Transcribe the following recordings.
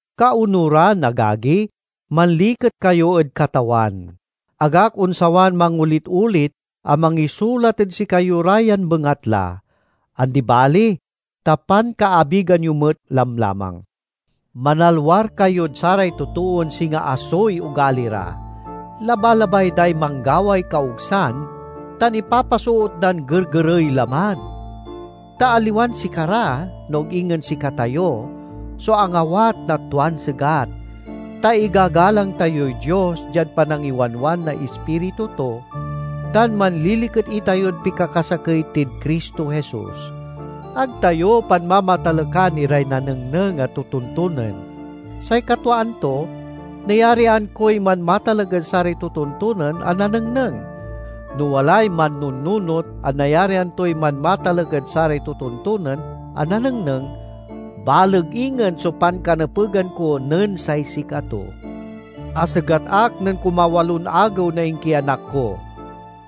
Kaonuran, agagi, manliket kayo ed Katawan. Ag ak onsawan mangolit olit a mangisulat ed sikayo ra yan bengatla; andi bali ta pankaabigan yo met lamlamang. Manalwar kayod saray totoon singa asoy ogali ra; labalabay day manggaway kaogsan tan ipapasoot dan gergerey laman. Ta aliwan sikara, no ag ingen sikatayo so angawat na tuan segat, ta igagalang tayoy Dios diad panangiwanwan na Ispiritu to, tan manliliket itayod pikakasakey tid Cristo Jesus. Ag tayo panmamatalekan iray nanengneng a totontonen. Say katwaan to, nayarian koy manmatalek ed saray totontonen a nanengneng. No walay mannununot a nayarian toy manmatalek ed saray totontonen a nanengneng, baleg ingen so pankanepegan ko nen say sikato. Asegat ak nen kumawalon agew na inkianak ko.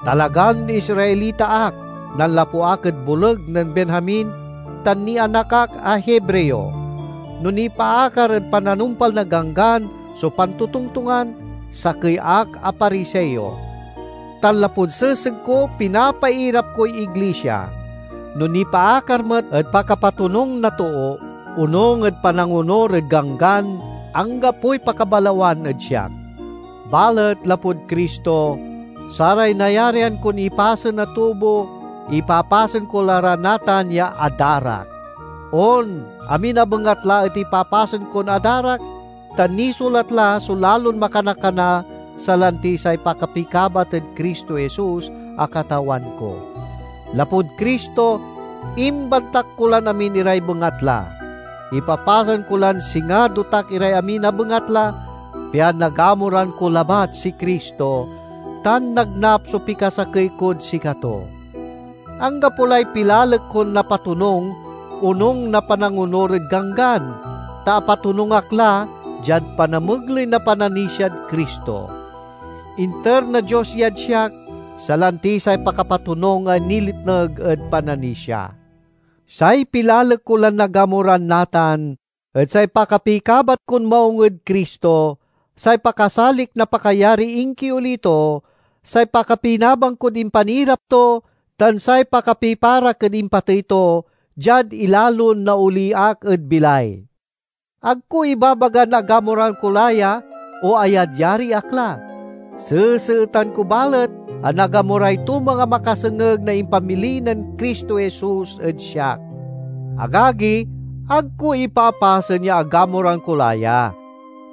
Talagan Israelita ak, nanlapu ak ed boleg nen Benjamin, tan nianak ak a Hebreo. No nipaakar ed pananumpal na ganggan so pantotongtongan, sakey ak a Pariseo. Tan lapud seseg ko, pinapairap koy iglisia. No nipaakar met ed pakapatonung na too, onung ed panangonur ed Ganggan, anggapoy pakabalawan ed siak. Balet lapud Cristo, saray nayarian kon ipasen a tubo, ipapasen ko la ra natan ya adarak. On, amin a bengatla et ipapasen kon adarak, ta nisulat la so lalon makana-kana, salanti say pakapikabat ed Cristo Jesus a Katawan ko. Lapud Cristo, imbantak ko lan amin iray bengatla; ipapasen ko lan singa dotak iray amin a bengatla, pian nagamuran ko labat si Cristo, tan nagnap so pikasakey kod sikato. Anggapo lay pilalek kon napatonung onung na panangonur ed Ganggan, ta apatonung ak la diad panamegley na pananisiad Cristo. Inter na Dios yad siak, salanti say pakapatonung a niletneg ed pananisia. Say pilalek ko lan nagamuran natan et say pakapikabat kon maung ed Cristo, say pakasalik na pakayariy inkioli to, say pakapinabang kod impanirap to, tan say pakapiparak ed impatey to, diad ilalon naoli ak ed bilay. Ag ko ibabagan agamuran ko la ya o ayadyari ak la. Seseetan ko balet a nagamuray tumang a makasengeg na impamili nen Cristo Jesus ed siak. Agagi, ag ko ipapasen ya agamuran ko la ya.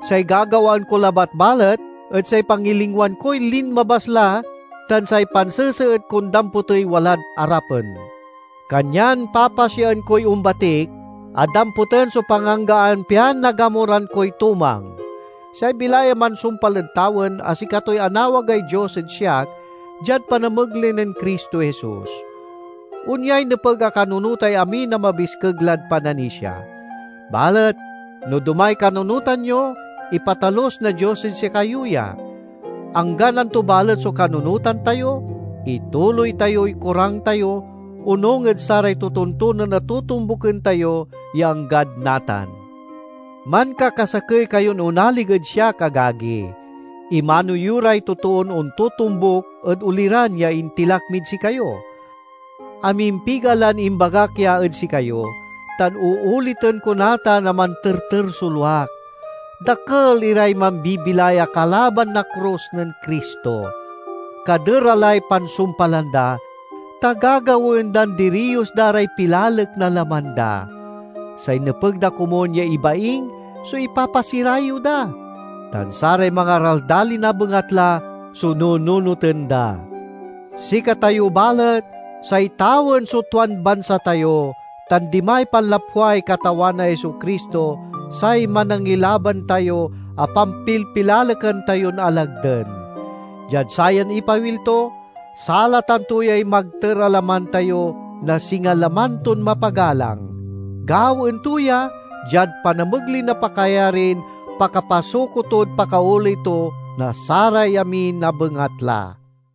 Say gagawaen ko labat balet et say pangilingwan koy linmabas la tan say panseseet kon damputey walad arapen. Kanyan papasiaen koy ombatik a damputen so panganggaan pian nagamuran koy tumang, say bilay a mansumpal ed tawen, a sikatoy anawagay Dios ed siak diad panamegley nen Cristo Jesus. Onyay nepeg a kanunotay amin a mabiskeg lad pananisia. Balet no domay kanunotan yo, ipatalus na Dios ed sikayo ya. Anggan anto balet so kanunotan tayo, ituloy tayoy korang tayo, onung ed saray totontonen a totombuken tayo ya anggad natan. Mankakasakey kayon onalig ed siak, agagi. Imano yo ray totoon ontotombuk ed oliran ya intilak mid sikayo. Amimpiga lan imbagak ya ed sikayo, tan ooliten ko natan a manterter so luak; dakel iray mambibilay a kalaban na krus nen Cristo. Kaderalay pansumpalan da, ta gagawaen dan diriyos da ray pilalek na laman da. Say nepeg da komun ya ibaing so ipapasirayew da, tan saray mangaraldalin a bengatla so nununoten da. Sikatayo balet, say tawen so tuan bansa tayo tan dimay panlapway Katawan a Jesu-Cristo, say Manangilaban tayo a pampilpilalekan tayon alagden. Diad sayan ipawil to, salatan to yay magter a laman tayo na singa laman ton mapagalang. Gawaen to ya, diad panamegley na pakayarin pakapasuko tod pakaoley to na saray amin a bengatla.